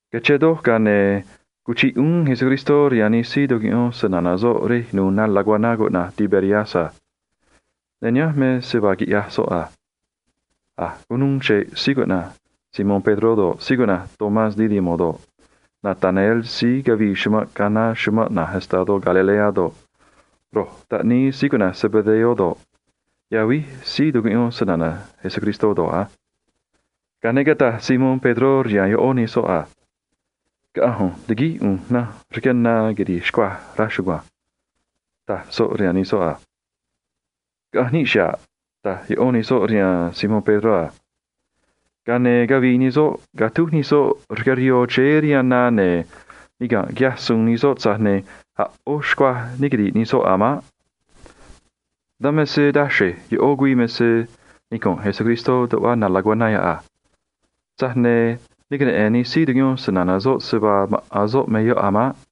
Cachén do̱j, ga̱a ne̱ cuchiꞌ uún Jesús rihaan nij síí tucuꞌyón snana̱ soꞌ rej nu̱u̱ na laguaná cuꞌna̱j Tiberias a. Ne̱ nihánj me se vaa quiꞌyaj soꞌ a. A̱j cunuu chre̱ꞌ síí cuꞌna̱j Simón Pedró do̱ꞌ, Tomás síí cuꞌna̱j cuaté do̱ꞌ, Natanael síí cavii chumanꞌ Caná chumanꞌ na̱j estadó Galilea do̱ꞌ, ro̱j taꞌníí síí cuꞌna̱j Zebedeo do̱ꞌ, yavíj síí tucuꞌyón snana̱ Jesús do̱ꞌ a. Ga̱a ne̱ cataj Simón Pedró rihaan ꞌó nij soꞌ a: ―Caꞌa̱nj ꞌu̱nj ti̱guíj ꞌu̱nj nanj rque na quiri̱j xcuaj, raj chugua̱nj ―taj soꞌ rihaan nij soꞌ a. ―Caꞌa̱nj níꞌ xa̱ꞌ ―taj ꞌó nij soꞌ rihaan Simón Pedró a. Ga̱a ne̱ cavii nij soꞌ catúj nij soꞌ rque rihoo chéé rihaan na, ne̱ niga̱nꞌ quiꞌyaj suun nij soꞌ, tza̱j ne̱ a̱ ꞌó xcuaj ne quiri̱ꞌ nij soꞌ a̱ maꞌ. Dan me se taxre̱j ꞌó güii me se nicunꞌ Jesús tuꞌva na laguaná yoꞌ a. Tza̱j ne̱ ne queneꞌe̱n nij síí tucuꞌyón snana̱ soꞌ se vaa maꞌa̱n soꞌ me síí yoꞌ a̱ maꞌ.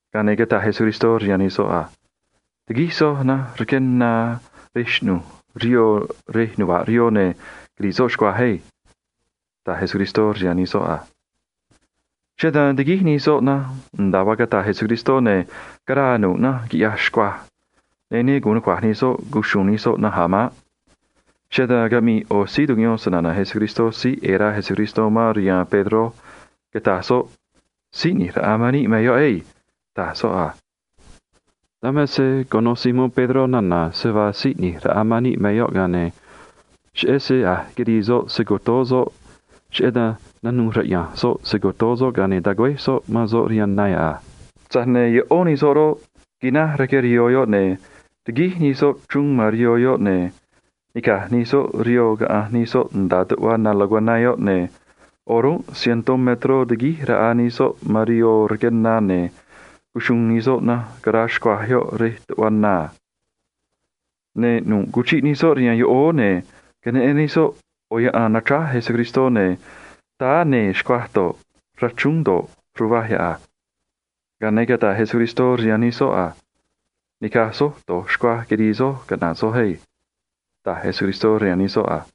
Ga̱a ne̱ cataj Jesús rihaan nij soꞌ a: ―Ti̱guíj soj nanj rque na rej xꞌnu̱j rihoo rej nuva̱ꞌ rihoo, ne̱ quiri̱ꞌ soj xcuaj á ―taj Jesús rihaan nij soꞌ a. Cheꞌé dan tiguíj nij soꞌ nanj nda̱a vaa cataj Jesús, ne̱ caraa nu̱ꞌ nanj, quiꞌyaj xcuaj, ne̱ ne gu̱un nucua̱j nij soꞌ cuxu̱u̱n nij soꞌ nanj a̱ maꞌ. Cheꞌé dan caꞌmii ꞌo̱ síí tucuꞌyón snana̱ Jesús síí ꞌe̱e̱ rá Jesús man rihaan Pedró, cataj soꞌ a: ―Jesús Si̱j ꞌNi̱j Raꞌa man níꞌ me soꞌ chugua̱nj ―taj soꞌ a. Dan me se cuno Simón Pedró nana̱ se vaa Síí ꞌNi̱j Raꞌa man níꞌ me síí yoꞌ, ga̱a ne̱ cheꞌé se a̱j quirii soꞌ se‑co̱toó soꞌ, cheꞌé dan nanuû raꞌya̱nj soꞌ se‑co̱toó soꞌ, ga̱a ne̱ tagüéj soꞌ man soꞌ rihaan na yoꞌ a. Tza̱j ne̱ ꞌó nij soꞌ roꞌ, quináj rque rihoo yoꞌ, ne̱ tiguíj nij soꞌ chruun man rihoo yoꞌ, ne̱ nica̱j nij soꞌ rihoo caꞌanj nij soꞌ nda̱a tuꞌva na laguaná yoꞌ a. Ne̱ o̱rúnꞌ cientó metró tiguíj raꞌa nij soꞌ man rihoo rque na, ne̱ cuxuun nij soꞌ nanj caraa xcuaj yoꞌ rej tuꞌva na a. Ne̱ nu̱ꞌ cuchiꞌ nij soꞌ rihaan yoꞌóó, ne̱ queneꞌen nij soꞌ ꞌo̱ yaꞌan nachráj Jesús, ne̱ táá nee̱ xcuaj do̱ꞌ, rachrúún do̱ꞌ, ruvaj yoꞌ a. Ga̱a ne̱ cataj Jesús rihaan nij soꞌ a: ―Ni̱caj soj do̱j xcuaj quirii soj caꞌna̱ꞌ soj á ―taj Jesús rihaan nij soꞌ a.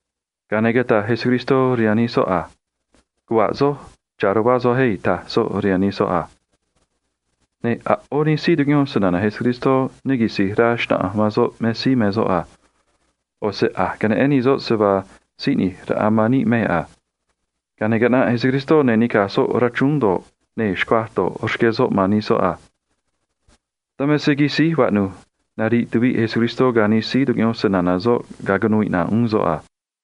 Ga̱a ne̱ cataj Jesús rihaan nij soꞌ a: ―Caꞌna̱ꞌ soj, cha̱ ruvá soj á ―taj soꞌ rihaan nij soꞌ a. Ne̱ a̱ ꞌó nij síí tucuꞌyón snana̱ Jesús ne quisi̱j rá xna̱ꞌanj man soꞌ me síí me soꞌ a. ꞌO̱ se a̱j queneꞌen nij soꞌ se vaa Síí ꞌNi̱j Raꞌa man níꞌ me síí yoꞌ a. Ga̱a ne̱ caꞌnaꞌ Jesús, ne̱ nica̱j soꞌ rachrúún do̱ꞌ, nee̱ xcuaj do̱ꞌ, rqué soꞌ man nij soꞌ a. Dan me se quisíj vaꞌnu̱j curuviꞌ Jesús rihaan nij síí tucuꞌyón snana̱ soꞌ ga̱a cunuu iꞌna̱ꞌ uún soꞌ a.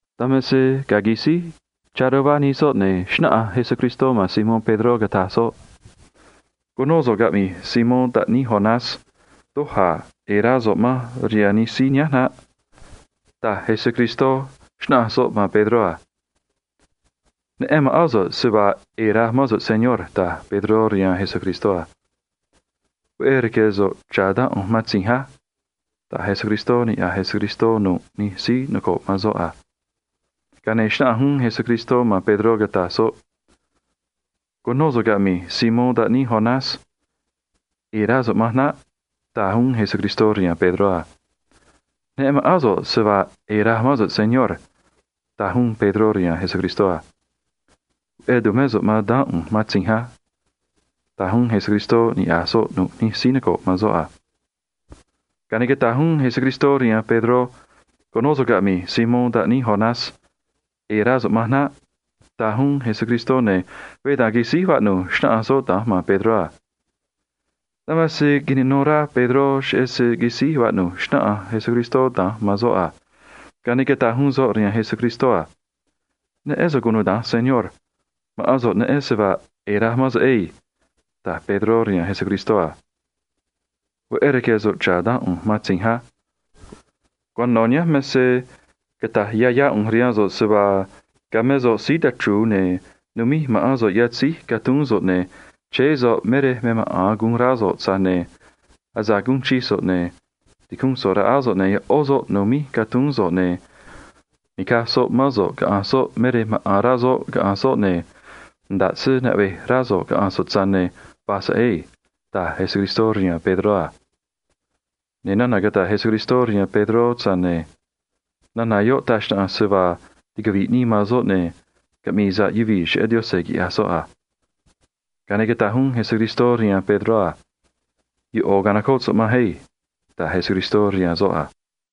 Dan me se ga̱a quisíj chá ruvá nij soꞌ, ne̱ xnáꞌanj Jesús man Simón Pedró, cataj soꞌ a: ―Cu̱nó so̱ꞌ caꞌmi̱j, Simón taꞌníí Jonás. Doj a̱ ꞌe̱e̱ rá so̱ꞌ manj rihaan nij síí nihánj naꞌ ―taj Jesús, xnáꞌanj soꞌ man Pedró a. ―Neꞌen ma̱ꞌán so̱ꞌ se vaa ꞌe̱e̱ raj mán so̱ꞌ, Señor ―taj Pedró rihaan Jesús a. ―Veꞌé rque̱ so̱ꞌ cha̱ daán ꞌu̱nj matzinj á ―taj Jesús rihaan Pedró a. Ga̱a ne̱ xnáꞌanj uún Jesús man Pedró, cataj soꞌ a: ―Cu̱nó so̱ꞌ caꞌmi̱j, Simón taꞌníí Jonás. ꞌE̱e̱ rá so̱ꞌ manj naꞌ ―taj uún Jesús rihaan Pedró a. ―Neꞌen ma̱ꞌán so̱ꞌ se vaa ꞌe̱e̱ raj mán so̱ꞌ, Señor ―taj uún Pedró rihaan Jesús a. ―Veꞌé tu̱mé so̱ꞌ man daán ꞌu̱nj matzinj á ―taj uún Jesús rihaan Pedró a. Ga̱a ne̱ cataj uún Jesús rihaan Pedró a: ―Cu̱nó so̱ꞌ caꞌmi̱j, Simón taꞌníí Jonás. ꞌE̱e̱ rá so̱ꞌ manj naꞌ ―taj uún Jesús a. Ne̱ veé da̱nj quisíj vaꞌnu̱j xnáꞌanj soꞌ da̱nj man Pedró a. Dan me se quinanó rá Pedró cheꞌé se quisíj vaꞌnu̱j xnáꞌanj Jesús da̱nj man soꞌ a. Ga̱a ne̱ cataj uún soꞌ rihaan Jesús a: ―Neꞌén so̱ꞌ cunuda̱nj, Señor. Ma̱ꞌán so̱ꞌ neꞌen se vaa ꞌe̱e̱ raj mán so̱ꞌ á ―taj Pedró rihaan Jesús a. ―Veꞌé rque̱ so̱ꞌ cha̱ daán ꞌu̱nj matzinj á. Cuano̱ nihánj me se cata̱j yá yá ꞌu̱nj rihaan so̱ꞌ se vaa ga̱a mé so̱ꞌ síí tachru̱u̱, ne̱ numíj ma̱ꞌán so̱ꞌ yatzéj catuún so̱ꞌ, ne̱ chéé so̱ꞌ me rej maꞌa̱n guun rá so̱ꞌ a. Tza̱j ne̱ asa̱ꞌ guún so̱ꞌ chii nga̱, ne̱ ti̱cúnꞌ so̱ꞌ raꞌá so̱ꞌ, ne̱ ꞌó soꞌ nu̱míj catuún so̱ꞌ, ne̱ ni̱caj soꞌ mán so̱ꞌ caꞌa̱nj soꞌ me rej maꞌa̱n rá soꞌ caꞌa̱nj soꞌ, ne̱ nda̱ꞌ se naꞌvej rá so̱ꞌ caꞌa̱nj so̱ꞌ, tza̱j ne̱ va̱j so̱ꞌ ado̱nj ―taj Jesús rihaan Pedró a. Ne̱ nana̱ cataj Jesús rihaan Pedró roꞌ, taj xnaꞌanj se vaa ticavi̱ꞌ nii man soꞌ, ne̱ cheꞌé dan sa̱ꞌ uxrá caꞌmi̱i̱ yuvii̱ cheꞌé Yaꞌanj, quiꞌya̱j soꞌ a. Ga̱a ne̱ cataj uún Jesús rihaan Pedró a: ―ꞌO̱ ca̱nocóꞌ so̱ꞌ manj á ―taj Jesús rihaan soꞌ a.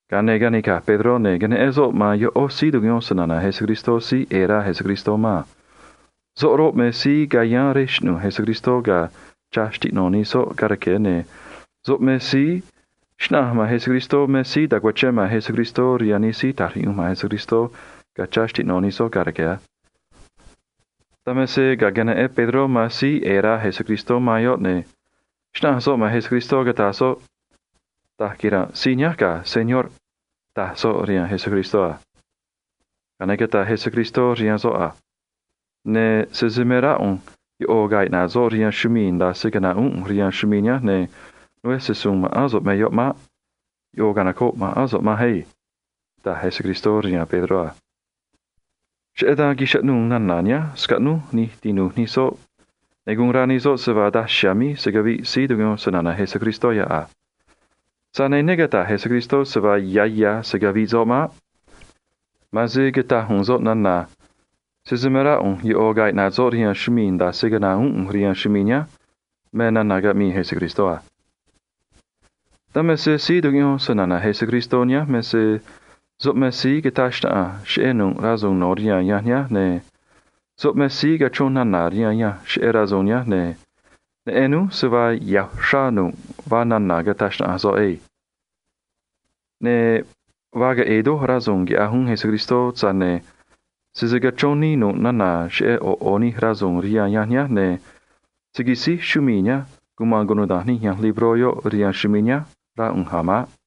Ga̱a ne̱ canica̱j Pedró, ne̱ queneꞌen soꞌ man ꞌó síí tucuꞌyón snana̱ Jesús síí ꞌe̱e̱ rá Jesús man a. Soꞌ roꞌ, me síí cayáán rej xꞌnu̱j Jesús ga̱a chá xtiꞌno̱ nij soꞌ ga̱a rque̱, ne̱ soꞌ me síí xnáꞌanj man Jesús me síí ta̱cuachén man Jesús rihaan nij síí ta̱j riꞌyunj man Jesús a. Dan me se ga̱a queneꞌen Pedró man síí ꞌe̱e̱ rá Jesús man yoꞌ, ne̱ xnáꞌanj soꞌ man Jesús, cataj soꞌ a: ―Señor, da̱j quira̱nꞌ síí nihánj ga̱ ―taj soꞌ rihaan Jesús a. Ga̱a ne̱ cataj Jesús rihaan soꞌ a: ―Ne̱ sese me rá ꞌu̱nj ꞌo̱ ga̱a̱ iꞌna̱ꞌ soꞌ rihaan chumii̱ nda̱a se caꞌna̱ꞌ uún ꞌu̱nj rihaan chumii̱ nihánj, ne̱ né se‑su̱u̱n ma̱ꞌán so̱ꞌ me yoꞌ maꞌ. ꞌO̱ canoco̱ꞌ ma̱ꞌán so̱ꞌ manj á ―taj Jesús rihaan Pedró a. Cheꞌé dan chaꞌnuu̱ nana̱ nihánj scaꞌnúj nij tinu̱j nij soꞌ, ne̱ guun rá nij soꞌ se vaa daj chiha̱a̱ míj se̱ caviꞌ síí tucuꞌyón snana̱ Jesús yoꞌ a. Tza̱j ne̱ ne cata̱j Jesús se vaa ya̱ ya̱ se̱ caviꞌ soꞌ maꞌ. Ma̱an se cataj u̱u̱n soꞌ nana̱ a: “Sese me rá ꞌu̱nj ꞌo̱ ga̱a̱ iꞌna̱ꞌ soꞌ rihaan chumii̱ nda̱a se caꞌna̱ꞌ uún ꞌu̱nj rihaan chumii̱ nihánj, ne̱ né se‑su̱u̱n ma̱ꞌán so̱ꞌ me yoꞌ maꞌ”, me nana̱ caꞌmii Jesús a. Dan me se síí tucuꞌyón snana̱ Jesús nihánj me se soꞌ me síí cataj xnaꞌanj cheꞌé nu̱ꞌ rasu̱u̱n no̱ rihaan yanj nihánj, ne̱ soꞌ me síí cachrón nana̱ rihaan yanj cheꞌé rasu̱u̱n nihánj ado̱nj. Ne̱ neꞌen núj se vaa ya̱ uxrá vaa nu̱ꞌ nana̱ cataj xnaꞌanj soꞌ na̱nj ado̱nj. Ne̱ vaa queꞌe̱e̱ doj rasu̱u̱n quiꞌyaj uún Jesús, tza̱j ne̱ sese cachrón nii nu̱ꞌ nana̱ cheꞌé ꞌo̱ ꞌo̱ nij rasu̱u̱n yoꞌ rihaan yanj nihánj, ne̱ se̱ quisíj chumii̱ nihánj cuma̱n cunuda̱nj nij yanj libró yoꞌ, rá ꞌu̱nj a̱ maꞌ.